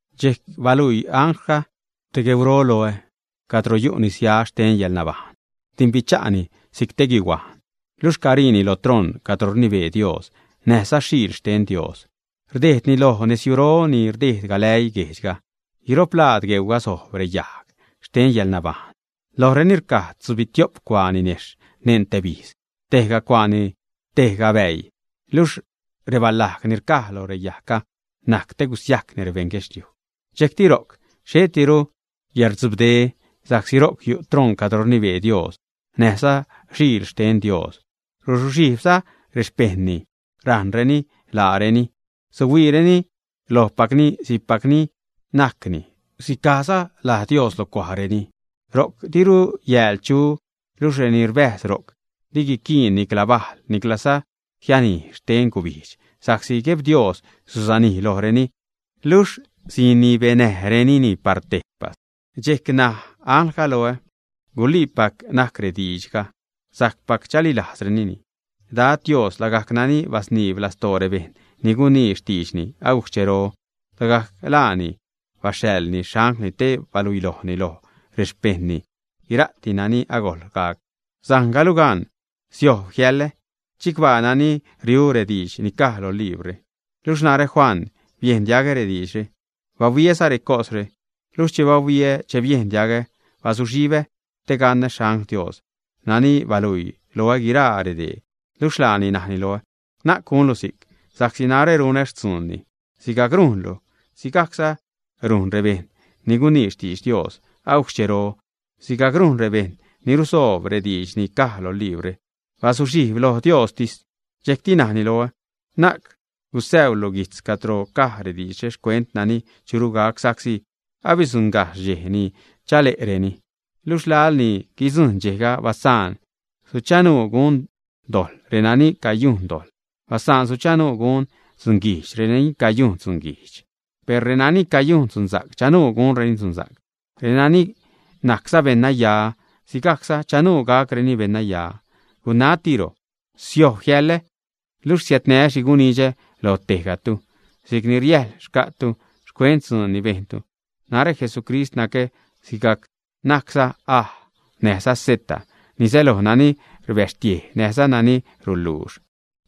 Dxejc baluii anglga te gueuro loä, cadro yu' nisya xten yäḻnabajṉ. Rdimbicha'ni si'c te guihuajn, luxh cariini lo troṉ cadro rnibee Dios näjza Xiil xten Dios, rdejdni loj nezyujro ni rdejd galäii guejdxga. Guiro'p laad gueuga sojb reyajg xten yäḻnabajṉ, lojreni rcaj tzubitio'p cuaa ninejxh neṉ tebijz, tejga cuaani tejga bäii; luxh rebalajg ni rcaj lo reyajgga najc te gusiajcni rebeṉ guedxliuj. Dxejcti ro'c xhettiru yäḻrdzubde, sa'csi ro'c yu' troṉ cadro rnibee Dios näjza Xiil xten Dios, ruzuxhijbza rexpejṉni, rajṉreni laareni. Suhuiireni lojpacni si'cpac ni najcni, sicajza laj Dios lo cuajreni. Ro'c diru yääl chu. Luxh reni rbäjz ro'c di guiquiin nicla bajl, niclaza xhanij xten gubijdx, sa'csi Gueb Dios susanij lojreni. Luxh sinibenäjrenini par tejpas. Dxejc naj anglga loä: ―Guliipac najc rediidxga, sajcpac chalilajzlureni. Dad Dios lagajc nani basniib lastoo rebejṉ ni gunii xtiidxni agujc xchero, lagajc laani baxhaḻni xanglni te baluilojni loj rexpejṉni guira'ti nani agojl gac. ―Sajngalu gan, siojb jiäḻa. ¡Chicbaa nani riu rediidx ni caj lo librre! Luxh narä, Juan, biejn diagä rediidxre, bahuiäza recosre. Luxh che bahuiä, che biejn diagä bazuxhibä te gaṉä xangl Dios nani baluii loä guiraa redee. Luxh laani najni loä: ―Na'c gunlu si'c, sa'csi narä runä xtzuunni sigajc rujnluni, sigajc rujn rebejṉ ni gunii xtidx Dios agujc xchero, sigajc rujn rebejṉ ni rusoob rediidx ni caj lo librre. Bazuxhijb loj Diostis. Dxejc najni loä: ―Na'c gusäuulu guijtz cadro caj rediidxre xcuent nani churu gac, sa'csi asiäddzuṉgajxh redxej ni chale'reni. Luxh laḻ ni guidzujṉ dxejga, basaan suchanuu gun dojḻ renani cayungajc dojḻ; basaan suchanuu gun dzunguijdx renani cayungajc dzunguijdx. Per renani cayujn dzunsa'c, chanuu gunreni dzunsa'c, nani najcza beṉnaya, si'cza chanuu gacni beṉnaya. Gunajtiro: ―Siojb jiäḻä, luxh siädnää́ xhi gunidxä loj tejgatu si'c ni riäjl xca'tu xcuent dzuun ni bejntu. Narä Jesucrist nacä si'c najcza A näjza Z, ni säloj nani rbäxtiej näjza nani ruluux.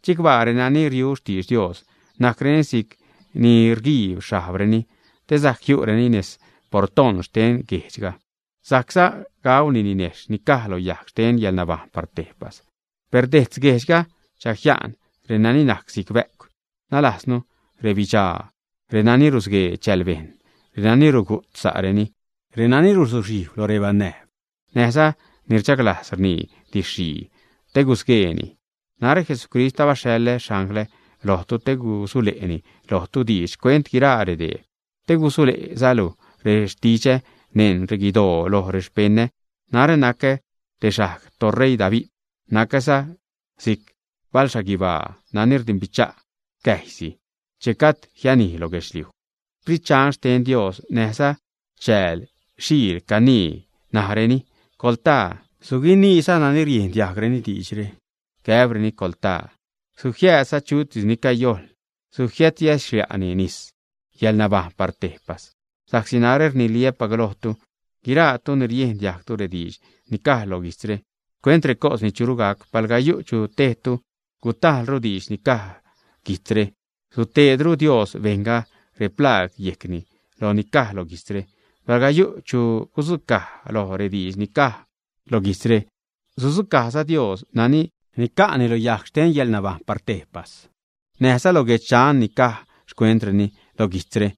’Chicbaa renani riu xtidx Dios, najcreni si'c ni rguiib xhajbreni te sajc jiu'reni nez portoṉ xten guejdxga, sajcza gauni ninejxh ni caj lo yajg xten yäḻnabajṉ par tejpas. Per dejtz guejdxga chajia'n reni najc si'c bä'cw, nalajznu rebidxaa, renani rusguee chälbejṉ, renani rugu't sa'reni, renani ruzuxhijb lo rebanäjb, näjza ni rchaglajz rnii didx-xhii te gusgueeni. ’Narä Jesucrist, abaxhaḻä xanglä lojlu te gusule'ni lojtu diidx xcuent guiraa redee, te gusule'zalu rextidxä neṉ reguidoo loj rexpeṉä. Narä nacä te xajg toṟeii David, nacäza si'c balxhaguibaa nani rdimbidxa' cäjysi che gajd jianij lo guedxliuj. Sprit Dxan xten Dios näjza chääl Xiil canii, najreni: ―Coḻtaa. Suguiniiza nani riejn diajgreni diidxre, gäbreni: ―Coḻtaa. Sujiäädza chutis ni cayojḻ, sujiädyäxlia'ni nis yäḻnabajṉ par tejpas. Sa'csi narä rniliä'ppac lojtu, guiraatu ni riejn diajgtu rediidx ni caj lo guijtzre xcuent recos ni churu gac, palga yu' chu tejtu gutajlru diidx ni caj guijtzre, suteedru Dios bejṉga replaag yejcni loj ni caj lo guijtzre. Palga yu' chu gudzucaj loj rediidx ni caj lo guijtzre, sudzucajza Dios nani nica'ni lo yajg xten yäḻnabajṉ par tejpas, näjza lo guedx Dxan, ni caj xcuentreni lo guijtzre.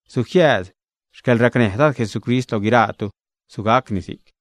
Sujiääd xcäḻracnäj Dad Jesucrist lo guiraatu. Sugacni si'c.